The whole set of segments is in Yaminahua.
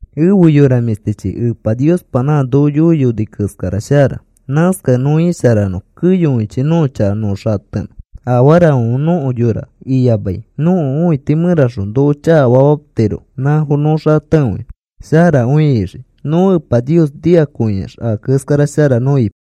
Ẽfe yora mĩshtichi, Epa Niospa nã noko yoiyoni keskara shara. Nãskakẽ nõ isharanõ keyokõichi nõko chaka nõ xatenõ. Afarafãfe nõko yora iyamai nõko õiti mẽraxõ noko chakafamatiro nãfo nõ xatekõinõ sharakõi ixiki. Nõ Epa Nios noikõiax a keskara shara nõ ipai.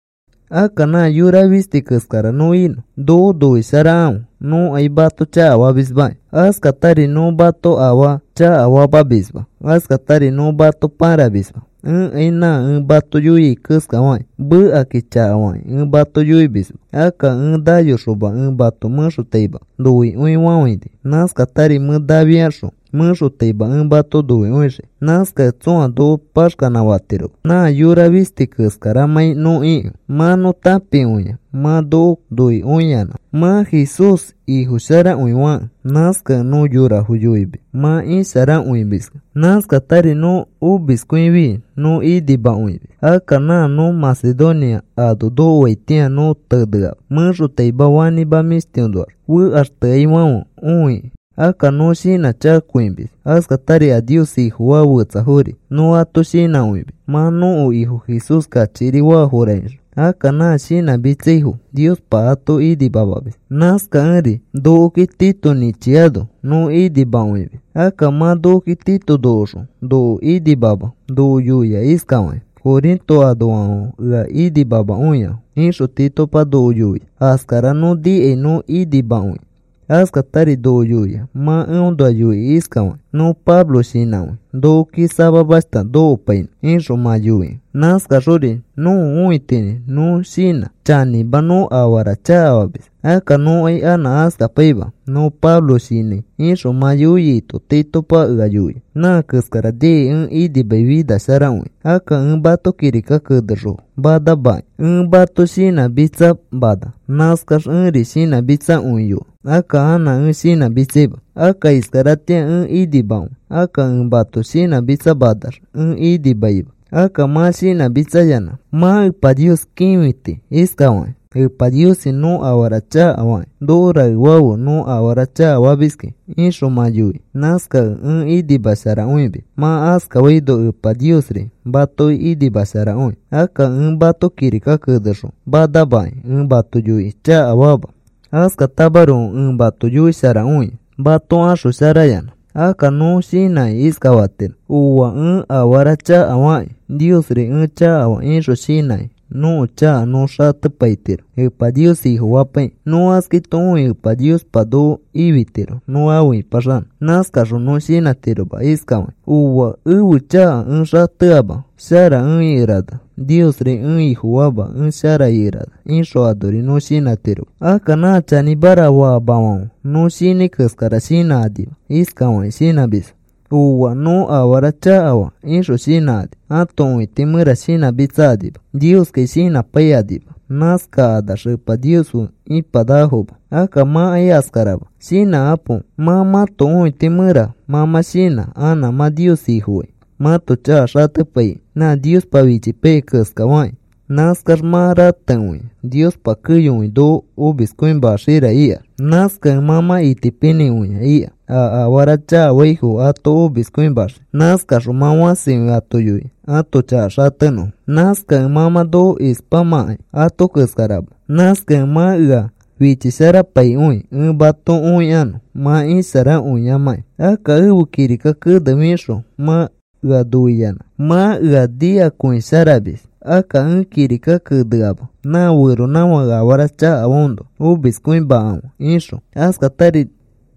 Akka nã yora fisti keskara nõ inõ noko noisharakãfe. Nõkai mato chakafamismaki. Askatari nõ mato afaa chakafamamisma, askatari nõ mato pãramisma. Ẽkai nã ẽ mato yoiai keskafakĩ mekakĩ chakafakĩ ẽ mato yoimisma. Akka ẽ nayoxoma ẽ mato mẽxotaima noikõifafãini. Nãskatari mẽ nafiaxõ mẽxotaima ẽ mato noikõixii. Nãskakẽ tsõa noko paxkanã fatiroma nã yora fisti keskaramãi nõ ikẽ. Mã nõ tãpikõia mã noko noikõiyanã, mã Jesús Ifo sharakõi fakẽ. Nãskakẽ nõ yorafo yoimis mã isharakõimiskẽ. Nãskatari nõ omiskõifi nõ inimakõimis. Akka nã nõ Macedonia ano nokoitatĩa nõ teneama, mẽxotaima fanĩma mĩshtinoax fekaxteaifãfe õi. Akka nõ shinãchakakõimis. Askatari a Nios Ifofaa fetsafori nõ ato shinãkõimis, mã nõko Ifo Jesús kachikiri faafora ixõ. Akka nã shinãmitsaifo Niospa ato inimamamis. Nãskakẽri nokoki Tito nĩchiano nõ inimakõimis. Akka mã nokoki Tito nokoxõ noko inimama noko yoia iskafakĩ: “Corinto anoafãfe ea inimamakõiafo,” ixõ Titopa noko yoia. Askara nõ nikai nõ inimakõia. Askatari noko yoia mã eõnoa yoikĩ iskafakĩ: “Nõ Pablo shinãkõi nokoki samamashta nokopainõ,” ixõ mã yoikẽ: “Nãskaxori nõko õitinĩ nõ shinã chanĩma nõ afara chakafamis. Akka nõkai anã askapaima. Nõ Pablo shinãi,” ixõ mã yoiaino Titopa ea yoia. Nã keskara nikai ẽ inimai finasharakõi. Akka ẽ mato kirika kenexõ manamakĩ ẽ mato shinãmitsamana. Nãskax ẽri shinãmitsakõiyoa. Akka anã ẽ shinãmitsaima. Akka iskaratĩa ẽ inimakõi. Akka ẽ mato shinãmitsamanax ẽ inimaima. Akka mã shinãmitsayanã mã Epa Nios kĩfiti iskafakĩ: “Epa Niosi, nõ afara chakafakĩ noko raefafe nõ afara chakafamiski,” ixõ mã yoikĩ. Nãskakẽ ẽ inimasharakõimis. Mã askafaino Epa Niosri matoki inimasharakõi. Akka ẽ mato kirika kenexõ manamakĩ ẽ mato yoikĩ chakafaama. Askatamaroko ẽ mato yoisharakõia mato axosharayanã. Akka nõ shinãkĩ iskafatiro: “Ooa, ẽ afara chakafakĩ, Niosri ẽ chakafaa,” ixõ shinãkĩ nõko chaka nõ xatepaitiro Epa Nios Ifofapaikĩ. Nõ askaito õikĩ Epa Niospa noko ifitiro nõ afe ĩpaxanõ. Nãskaxõ nõ shinãtiroma iskafakĩ: “Ooa, ẽfe chaka ẽ xateama shara ẽ ikerana. Niosri ẽ Ifofaama ẽ shara ikerana,” ixõ anori nõ shinãtiroma. Akka nã chanĩmara faamafãfe nõ shinãi keskara shinãkanima. Iskafakĩ shinãmisfo: “Ooa, nõ afara chakafaa,” ixõ shinãkani ãto õiti mẽra shinãmitsakanima Nioskai shinãpaikanima. Nãskax nakanax Epa Nios fe ipanakafoma. Akka mãkai askarama. Shinãkapo. Mã mãto õiti mẽraxõ mã mã shinã anã mã Nios Ifofai mãto chaka xatepaikĩ nã Niospa fichipaiyai keskafakĩ. Nãskax mã ratekõia Niospa keyokõi noko omiskõimaxira ikax. Nãskakẽ mã mã itipinĩkõia ika a afara chakafaifo ato omiskõimaxiki. Nãskaxõ mã fãsikõi ato yoia ãto chaka xatenõfo. Nãskakẽ mã mã noko ispamãkai ato keskarama. Nãskakẽ mã ea fichisharapaikõi ẽ mato õikanõ mã isharakõiyamãkĩ. Akka ẽfe kirika kene fixõ mã ea noiyanã mã ea nikakõisharamis. Akka ẽ kirika keneama, nã feronãfãke afara chakafaaõnoa omiskõimakãfe ixõ. Askatari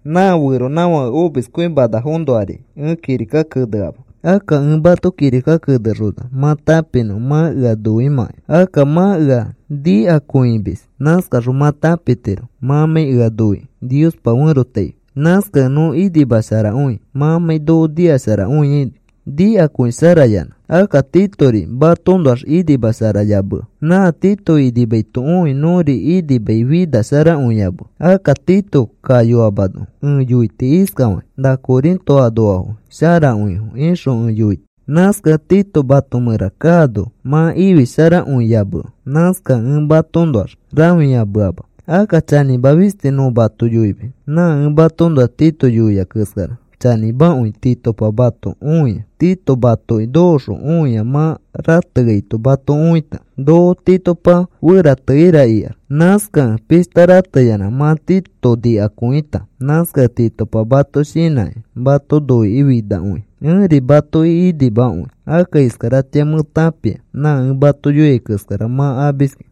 nã feronãfãke omiskõimanafoõnoari ẽ kirika keneama. Akka ẽ mato kirika kenexona mã tãpinõ mã ea noimãkai. Akka mã ea nikakõimis. Nãskaxõ mã tãpitiro mãmãi ea noikĩ Niospa ferotaifi. Nãskakẽ nõ inimasharakõi, mãmãi noko noisharakõiaino nikakõisharayanã. Akka Titori matoõnoax inimasharayamea. Nã Tito inimaito õi nõri inimaifinasharakõiyamea. Akka Tito kayoamano ẽ yoiti iskafakĩ: “Na Corinto anoafo sharakõifo,” ixõ ẽ yoiti. Nãskakẽ Tito mato mẽra kaano mã ifisharakõiyamea. Nãskakẽ ẽ matoõnoax rãfiyameama. Akka chanĩma fisti nõ mato yoimis. Nã ẽ matoõnoa Tito yoia keskara chanĩmakõi Titopa mato õia. Tito matoki nokoxõ õia mã rateaito mato õita noko Titopa ferateneira ikax. Nãskakẽ pishta rateyanã mã Tito nikakõita. Nãskakẽ Titopa mato shinãkĩ, mato noikĩ finakõi. Ẽri matoki inimakõi. Akka iskaratĩa mẽ tãpia nã ẽ mato yoiai keskara mã amiskẽ.